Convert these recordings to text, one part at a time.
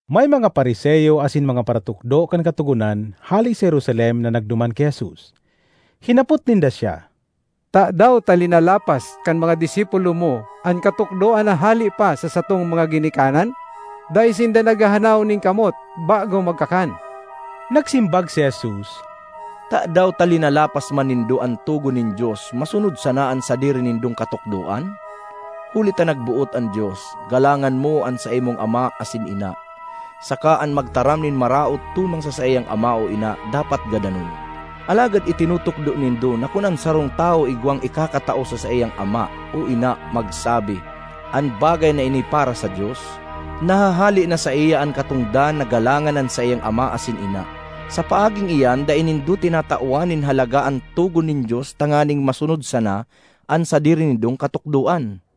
May mga Fariseo asin mga paratukdo kan Katogonan hale sa Jerusalem na nagduman ki Jesus. Hinapot ninda siya, ”Tadaw ta linalapas kan mga disipulo mo an katukdoan na hale pa sa satong mga ginikanan? Dai sinda naghahanaw nin kamot bago magkakan!” Nagsimbag si Jesus, “Tadaw ta linalapas man nindo an togon nin Dios masunod sana an sadiri nindong katukdoan? Huli ta nagboot an Dios, ‘Galangan mo an saimong ama asin ina,’ saka ‘An magtaram nin maraot tumang sa saiyang ama o ina dapat gadanon.’ Alagad itinutukdo nindo na kun an sarong tawo igwang ikakatao sa saiyang ama o ina magsabi, ‘An bagay na ini para sa Dios,’ nahahale na saiya an katongdan na galangan an saiyang ama asin ina. Sa paaging iyan dai nindo tinatawan nin halaga an togon nin Dios tanganing masunod sana an sadiri nindong katukdoan.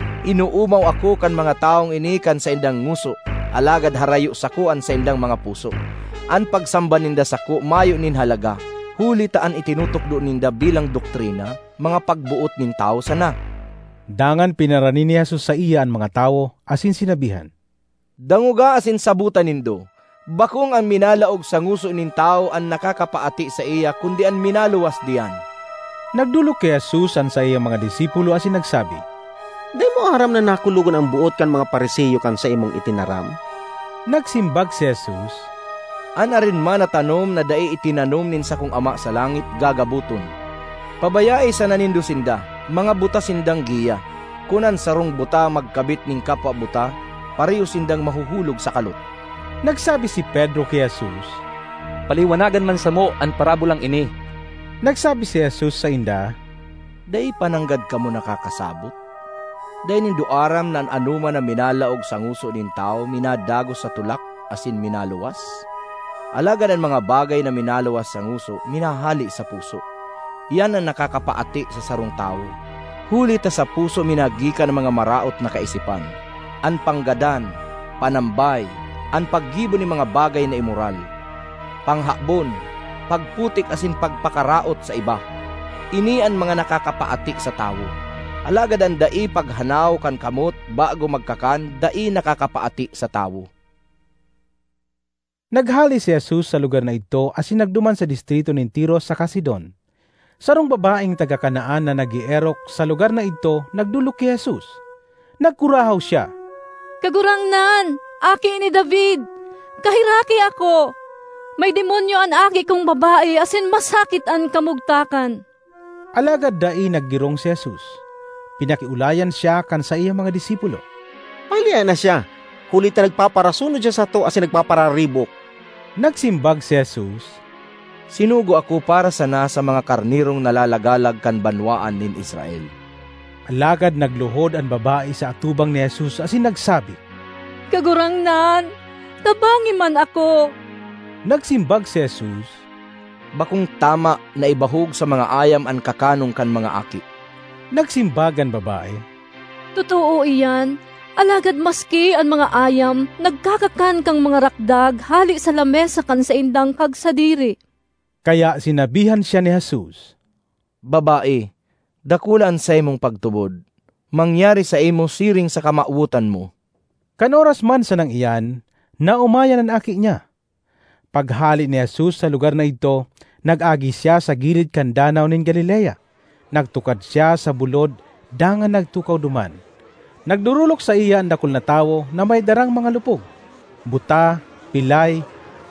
‘Inoomaw ako kan mga tawong ini kan saindang ngoso, alagad harayo sako an saindang mga puso. An pagsamba ninda sako mayo nin halaga, huli ta an itinutukdo ninda bilang doktrina, mga pagboot nin tawo sana!’” Dangan pinarani ni Jesus saiya an mga tawo asin sinabihan, “Dangoga asin sabota nindo: bakong an minalaog sa ngoso nin tawo an nakakapaati saiya kundi an minaluwas diyan.” Nagdolok ki Jesus an saiyang mga disipulo asin nagsabi, “Dai mo aram na nakulogan an boot kan mga Fariseo kan saimong itinaram?” Nagsimbag si Jesus, “An arin man na tanom na dai itinanom nin sakong Ama sa langit, gagaboton. Pabayae sana nindo sinda; mga buta sindang giya. Kun an sarong buta magkabit nin kapwa buta, pareho sindang mahuhulog sa kalot.” Nagsabi si Pedro ki Jesus, “Paliwanagan man samo an parabolang ini.” Nagsabi si Jesus sainda, “Dai pa nanggad kamo nakakasabot? Dai nindo aram na an anoman na minalaog sa ngoso nin tawo minadagos sa tulak asin minaluwas? Alagad an mga bagay na minaluwas sa ngoso, minahale sa puso; iyan an nakakapaati sa sarong tawo. Huli ta sa puso minagikan an mga maraot na kaisipan, an panggadan, panambay, an paggibo nin mga bagay na imoral, panghabon, pagputik asin pagpakaraot sa iba. Ini an mga nakakapaati sa tawo; alagad an dai paghanaw kan kamot bago magkakan dai nakakapaati sa tawo.” Naghale si Jesus sa lugar na idto asin nagduman sa distrito nin Tiro saka Sidon. Sarong babaeng taga Canaan na nag-eerok sa lugar na idto nagdolok ki Jesus. Nagkurahaw siya, “Kagurangnan, Aki ni David! Kaheraki ako! May demonyo an aki kong babae asin masakit an kamugtakan.” Alagad dai naggirong si Jesus. Pinakiolayan siya kan saiyang mga disipulo, “Pahalea na siya huli ta nagpaparasunod siya sato asin nagpapararibok!” Nagsimbag si Jesus, “Sinugo ako para sana sa mga karnerong nalalagalag kan banwaan nin Israel.” Alagad nagluhod an babae sa atubang ni Jesus asin nagsabi, “Kagurangnan, tabangi man ako!” Nagsimbag si Jesus, “Bakong tama na ibahog sa mga ayam an kakanon kan mga aki.” Nagsimbag an babae, “Totoo iyan, alagad maski an mga ayam nagkakakan kan mga rakdag hale sa lamesa kan saindang kagsadiri.” Kaya sinabihan siya ni Jesus, “Babae, dakula an saimong pagtubod! Mangyari saimo siring sa kamawotan mo.” Kan oras man sanang iyan naomayan an aki niya. Paghale ni Jesus sa lugar na idto, nag-agi siya sa gilid kan Danaw nin Galilea. Nagtukad siya sa bulod dangan nagtukaw duman. Nagdorolok saiya an dakul na tawo na may darang mga lupog, buta, pilay,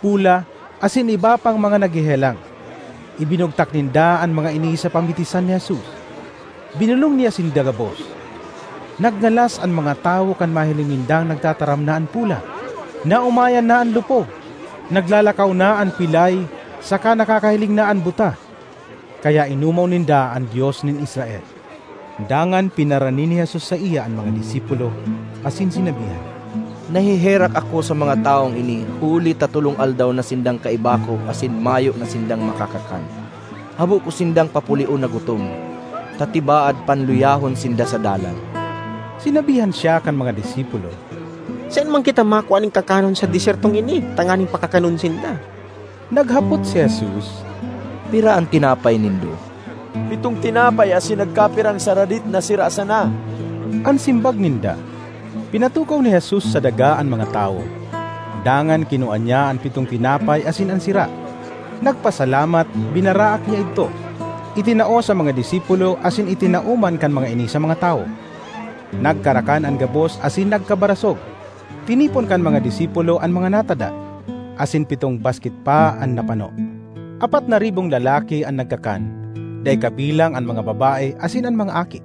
pola, asin iba pang mga naghehelang. Ibinugtak ninda an mga ini sa pamitisan ni Jesus; binolong niya sinda gabos. Nagngalas an mga tawo kan mahiling nindang nagtataram na an pola, naomayan na an lupog, naglalakaw na an pilay saka nakakahiling na an buta; kaya inomaw ninda an Dios nin Israel. Dangan pinarani ni Jesus saiya an mga disipulo asin sinabihan, “Naheherak ako sa mga tawong ini huli ta tolong aldaw na sindang kaiba ko asin mayo na sindang makakakan. Habo ko sindang papulion na gutom, ta tibaad panluyahon sinda sa dalan.” Sinabihan siya kan mga disipulo, “Saen man kita makua nin kakanon sa desyertong ini tanganing pakakanon sinda?” Naghapot si Jesus, “Pira an tinapay nindo?” “Pitong tinapay asin nagkapirang saradit na sira sana,” an simbag ninda. Pinatukaw ni Jesus sa daga an mga tawo. Dangan kinua niya an pitong tinapay asin an sira, nagpasalamat, binaraak niya idto, itinao sa mga disipulo asin itinao man kan mga ini sa mga tawo. Nagkarakan an gabos asin nagkabarasog. Tinipon kan mga disipulo an mga natada, asin pitong basket pa an napano. Apat na ribong lalaki an nagkakan, dai kabilang an mga babae asin an mga aki.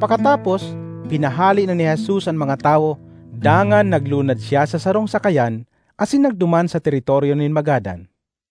Pakatapos, pinahale na ni Jesus an mga tawo dangan naglunad siya sa sarong sakayan asin nagduman sa teritoryo nin Magadan.